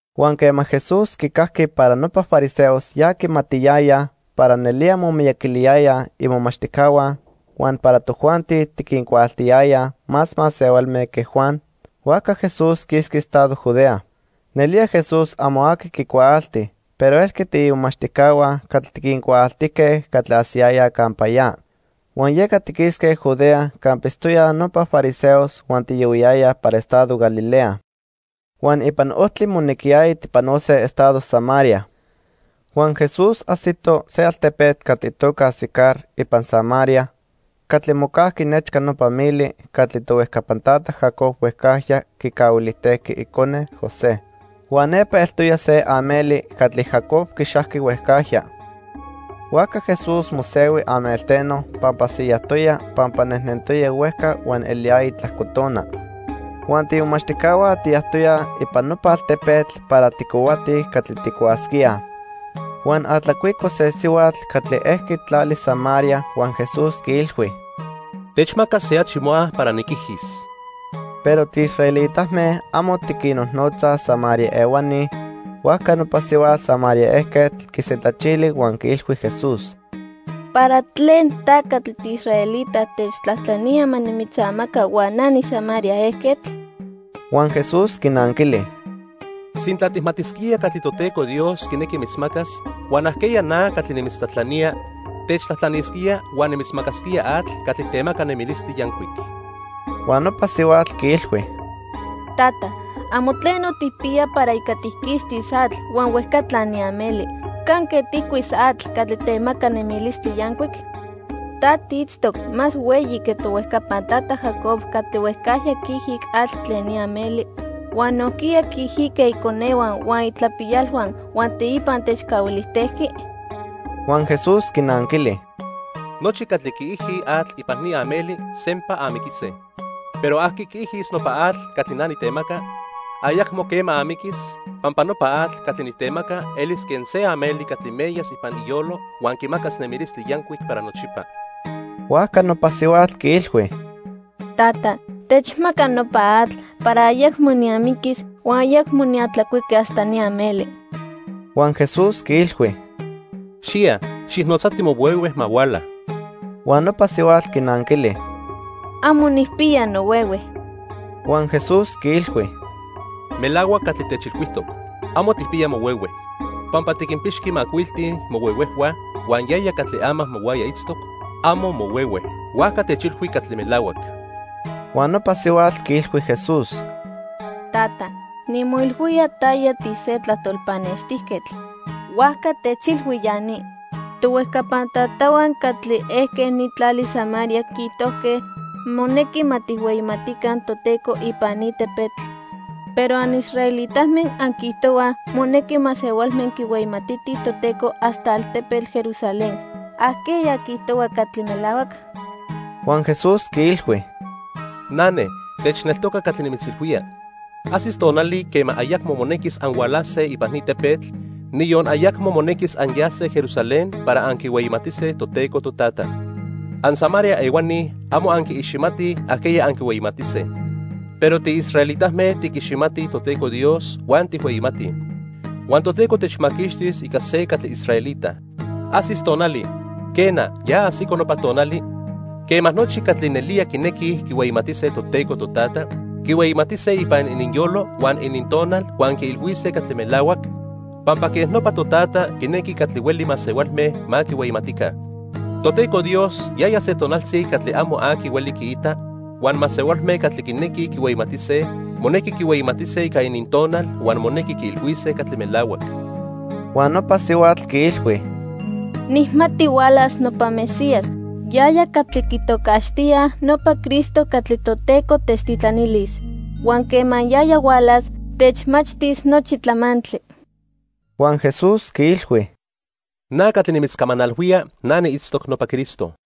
Huan quema Jesús quicajqui para nopa fariseos ya quimatiyayaj para nelía momiyaquiliyayaj imomachtijcahua huan para tojuanti tiquincuaaltiyayaj más masehualme que Juan, huajca Jesús quisqui estado Judea. Nelía Jesús amo aqui quicuaalti, pero elque tiimomachtijcahua catli tiquincuaaltijque catli ajsiyayaj campa ya. Huan yeca tiquisque Judea campa itztoyaj nopa fariseos huan tiyohuiyayaj para estado Galilea. Huan ipan ojtli monequiyaya tijpanose estado Samaria. Huan Jesús ajsito se altepetl catli itoca Sicar ipan Samaria catli mocajqui nechca nopa mili catli tohuejcapan tata Jacob huejcajya quicahuilijtejqui icone, José. Huan nepa eltoya se ameli catli Jacob quixajqui huejcajya. Huajca Jesús mosehui amelteno pampa siyajtoya pampa nejnentoya huejca huan eliyaya tlajco tona. Huan tiimomachtijcahua tiyajtoyaj ipan nopa altepetl para tijcohuatij catli tijcuasquíaj. Huan atlacuico se sihuatl catli ejqui tlali Samaria huan Jesús quiilhui: —Techmaca se achi moa para niquijis. Pero tiisraelitame amo tiquinnojnotzaj Samaria ehuani, huajca nopa sihuatl Samaria ejquetl quisentlachili huan quiilhui Jesús: —¿Para tlen ta catli tiisraelita techtlajtlanía ma nimitzamaca huan na niSamaria ejquetl? Huan Jesús quinanquili: —Sintla tijmatisquía catli Toteco Dios quinequi mitzmacas huan ajqueya na catli nimitzatlajtlanía, techtlajtlanisquía huan nimitzmacasquía atl catli temaca nemilistli yancuic. Huan nopa sihuatl quiilhui: —Tata, amo tleno tijpiya para ica tijquixtis atl huan huejcatla ni ameli. ¿Canque tijcuis atl catli temaca nemilistli yancuic? ¿Ta tiitztoc más hueyi que tohuejcapan tata Jacob catli huejcajya quiijic atl tlen ni ameli huan nojquiya quiijique iconehua huan itlapiyalhua, huan teipa techcahuilijtejqui? Huan Jesús quinanquili: —Nochi catli quiijij atl ipan ni ameli sempa amiquise. Pero aqui quiijis nopa atl catli na nitemaca, ayacmo quema amiquis, pampa nopa atl catli nitemaca elis quen se ameli catli meyas ipan iyolo huan quimacas nemilistli yancuic para nochipa. Huajca nopa sihuatl quiilhui: —Tata, techmaca nopa atl para ayacmo niamiquis huan ayacmo niatlacuiqui hasta ni ameli. Huan Jesús quiilhui: —Xiya, xijnotzati mohuehue ma huala. Huan nopa sihuatl quinanquili: —Amo nijpiya nohuehue. Huan Jesús quiilhui: —Melahuac catli techilhuijtoc, amo tijpiya mohuehue. Pampa tiquinpixqui macuilti mohuehuejhua huan yaya catli ama mohuaya itztoc, amo mohuehue. Huajca techilhui catli melahuac. Huan nopa sihuatl quiilhui Jesús: —Tata, nimoilhuía taya tise tlajtol pannextijquetl. Huajca techilhui ya ni. Tohuejcapan tatahua catli ejque ni tlali Samaria quiijtojque monequi ma tijhueyimatica Toteco ipan ni tepetl, pero anisraelitame anquiijtohuaj monequi masehualme quihueyimatitij Toteco hasta altepetl Jerusalén. ¿Ajqueya quiijtohua catli melahuac? Huan Jesús quiilhui: —Nane, techneltoca catli nimitzilhuía. Ajsis tonali quema ayacmo monequis anhualase ipan ni tepetl, niyon ayacmo monequis anyase Jerusalén para anquihueyimatise Toteco Totata. AnSamaria ehuani amo anquiiximatij ajqueya anquihueyimatise. Pero tiisraelitame tiquiximatij Toteco Dios huan tijhueyimatij. Huan Toteco temaquixtis ica se catli israelita. Ajsis tonali, quena, ya ajsico nopa tonali, quema nochi catli nelía quinequij quihueyimatise Toteco Totata, quihueyimatise ipan ininyolo huan inintonal huan quiilhuise catli melahuac, pampa quej nopa Totata quinequi catli hueli masehualme ma quihueyimatica. Toteco Dios yaya se tonaltzi catli amo aqui hueli quiita, huan masehualme catli quinequij quihueyimatise, monequi quihueyimatise ica inintonal huan monequi quiilhuise catli melahuac. Huan nopa sihuatl quiilhui: —Nijmati hualas nopa Mesías, yaya catli quitocaxtíaj nopa Cristo catli Toteco techtitlanilis. Huan quema yaya hualas, techmachtis nochi tlamantli. Huan Jesús quiilhui: —Na catli nimitzcamanalhuía, na niitztoc nopa Cristo.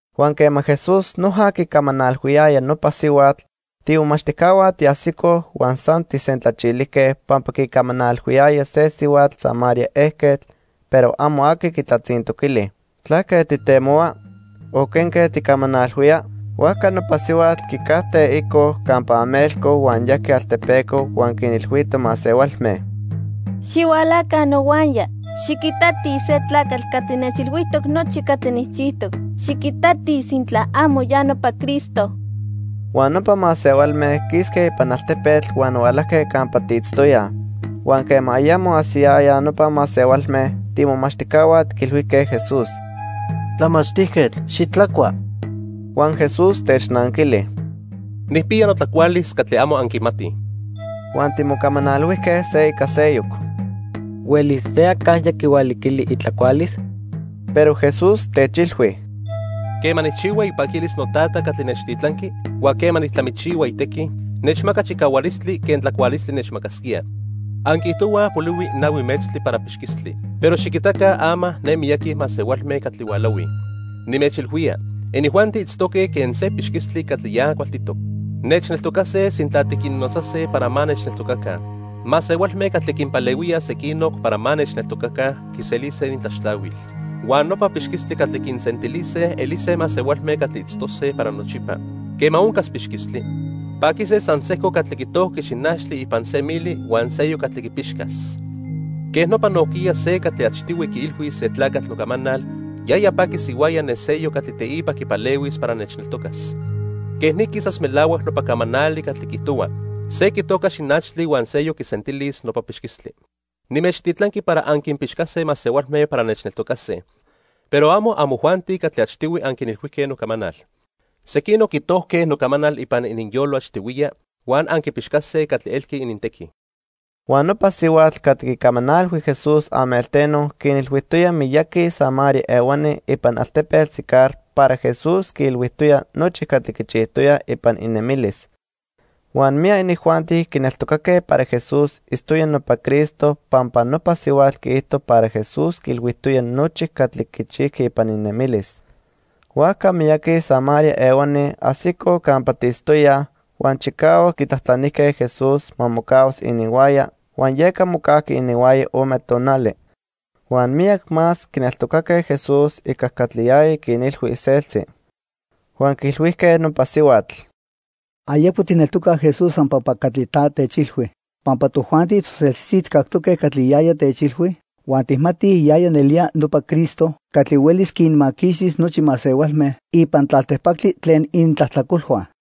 Huan quema Jesús noja quicamanalhuiyaya nopa sihuatl, tiimomachtijcahua tiajsicoj huan san tijsentlachilijque pampa quicamanalhuiyaya se sihuatl Samaria ejquetl, pero amo aqui quitlatzintoquili: "¿Tlaque tijtemohua?" o "¿quenque tijcamanalhuía?" Huajca nopa sihuatl quicajte ico campa amelco huan yajqui altepeco huan quinilhuito masehualme: —Xihualaca nohuaya, xiquitatij se tlacatl catli nechilhuijtoc nochi catli nijchijtoc. Xiquitatij sintla amo ya nopa Cristo. Huan nopa masehualme quisque ipan altepetl huan hualajque campa tiitztoyaj. Huan quema ayamo ajsiyayaj nopa masehualme, tiimomachtijcahua tiquilhuijque Jesús: —Tlamachtijquetl, xitlacua. Huan Jesús technanquili: —Nijpiya notlacualis catli amo anquimatij. Huan timocamanalhuijque se ica seyoc: —¿Huelis se acajya quihualiquili itlacualis? Pero Jesús techilhui: —Quema nijchihua ipaquilis noTata catli nechtitlanqui huan quema nijtlamichihua itequi, nechmaca chicahualistli quen tlacualistli nechmacasquía. Anquiijtohuaj polihui nahui metztli para pixquistli. Pero xiquitaca ama ne miyaqui masehualme catli hualahuij. Nimechilhuía, inijuanti itztoque quen se pixquistli catli ya cualtitoc. Nechneltocase sintla tiquinnotzase para ma nechneltocaca. Masehualme catli quinpalehuíaj sequinoc para ma nechneltocaca quiselise inintlaxtlahuil. Huan nopa pixquistli catli quinsentilise elise masehualme catli itztose para nochipa. Quema oncas pixquistli, paquise san sejco catli quitojqui xinachtli ipan se mili huan seyoc catli quipixcas. Quej nopa nojquiya se catli achtihui quiilhuis se tlacatl nocamanal, yaya paquis ihuaya ne seyoc catli teipa quipalehuis para nechneltocas. Quej ni quisas melahuac nopa camanali catli quiijtohua: 'Se quitoca xinachtli huan seyoc quisentilis nopa pixquistli.' Nimechtitlanqui para anquinpixcase masehualme para nechneltocase. Pero amo amojuanti catli achtihui anquinilhuijque nocamanal. Sequinoc quitojque nocamanal ipan ininyolo achtihuiya, huan anquipixcase catli elqui inintequi. Huan nopa sihuatl catli quicamanalhui Jesús amelteno quinilhuijtoya miyaqui Samaria ehuani ipan altepetl Sicar para Jesús quiilhuijtoya nochi catli quichijtoya ipan inemilis. Huan miyac inijuanti quineltocaque para Jesús itztoya nopa Cristo pampa nopa sihuatl quiijto para Jesús quiilhuijtoya nochi catli quichijqui ipan inemilis. Huajca miyaqui Samaria ehuani ajsicoj campa tiitztoyaj, huan chicahuac quitlajtlanijque Jesús ma mocahuas ininhuaya, huan yeca mocajqui ininhuaya ome tonali. Huan miyac más quineltocaque Jesús ica catli yaya quinilhui iseltzi. Huan quiilhuijque nopa sihuatl: —Ayacmo tijneltocaj Jesús san pampa catli ta techilhui, pampa tojuanti toseltzitzi tijcactoque catli yaya techilhui, huan tijmatij yaya nelía nopa Cristo catli huelis quinmaquixtis nochi masehualme ipan tlaltipactli tlen inintlajtlacolhua.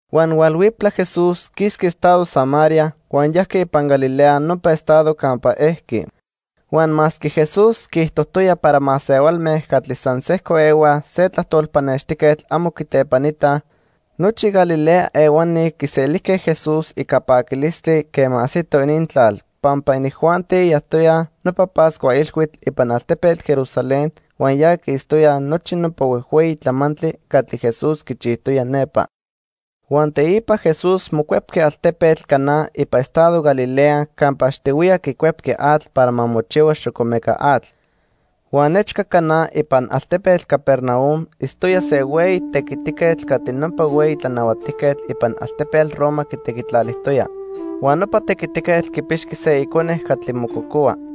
Huan hualhuiptla Jesús quisqui estado Samaria huan yajqui ipan Galilea nopa estado campa ejqui. Huan masque Jesús quiijtojtoya para masehualme catli san sejco ehuaj se tlajtol pannextijquetl amo quitlepanitaj, nochi Galilea ehuani quiselijque Jesús ica paquilistli quema ajsito inintlal, pampa inijuanti yajtoyaj nopa Pascua Ilhuitl ipan altepetl Jerusalén huan ya quiitztoyaj nochi nopa huejhueyi tlamantli catli Jesús quichijtoya nepa. Huan teipa Jesús mocuepqui altepetl Caná ipan estado Galilea campa achtihuiya quicuepqui atl para ma mochihua xocomeca atl. Huan nechca Caná ipan altepetl Capernaum itztoya se hueyi tequitiquetl catli nopa hueyi tlanahuatijquetl ipan altepetl Roma quitequitlalijtoya. Huan nopa tequitiquetl quipixqui se icone catli mococohua.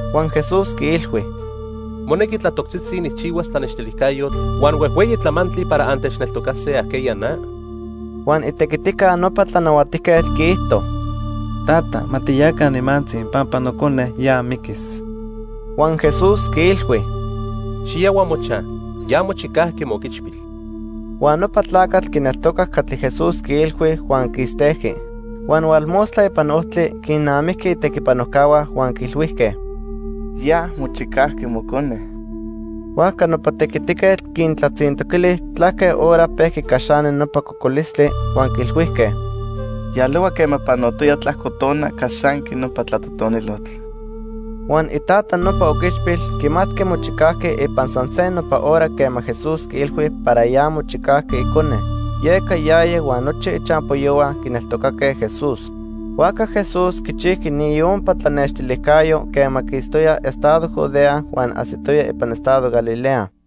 Huan Jesús quiilhui: —¿Monequi tlatoctzitzi nijchihuas tlanextilijcayotl huan huejhueyi tlamantli para antechneltocase ajqueya na? Huan itequitica nopa tlanahuatijquetl quiijto: —Tata, ma tiyaca nimantzi pampa nocone ya miquis. Huan Jesús quiilhui: —Xiyahua mochaj. Ya mochicajqui mooquichpil. Huan nopa tlacatl quineltocac catli Jesús quiilhui huan quistejqui. Huan hualmostla ipan ojtli quinnamijqui itequipanojcahua huan quiilhuijque: —Ya mochicajqui mocone. Huajca nopa tequitiquetl quintlatzintoquili tlaque hora pejqui caxani nopa cocolistli, huan quiilhuijque: —Yalohua quema panotoya tlajco tona caxanqui nopa tlatotonilotl. Huan itata nopa oquichpil quimatqui mochicajqui ipan san se nopa hora quema Jesús quiilhui para ya mochicajqui icone, yeca yaya huan nochi ichampoyohua quineltocaque Jesús. Huajca Jesús quichijqui ni iompa tlanextilijcayo quema quistoya estado Judea huan ajsitoya ipan estado Galilea.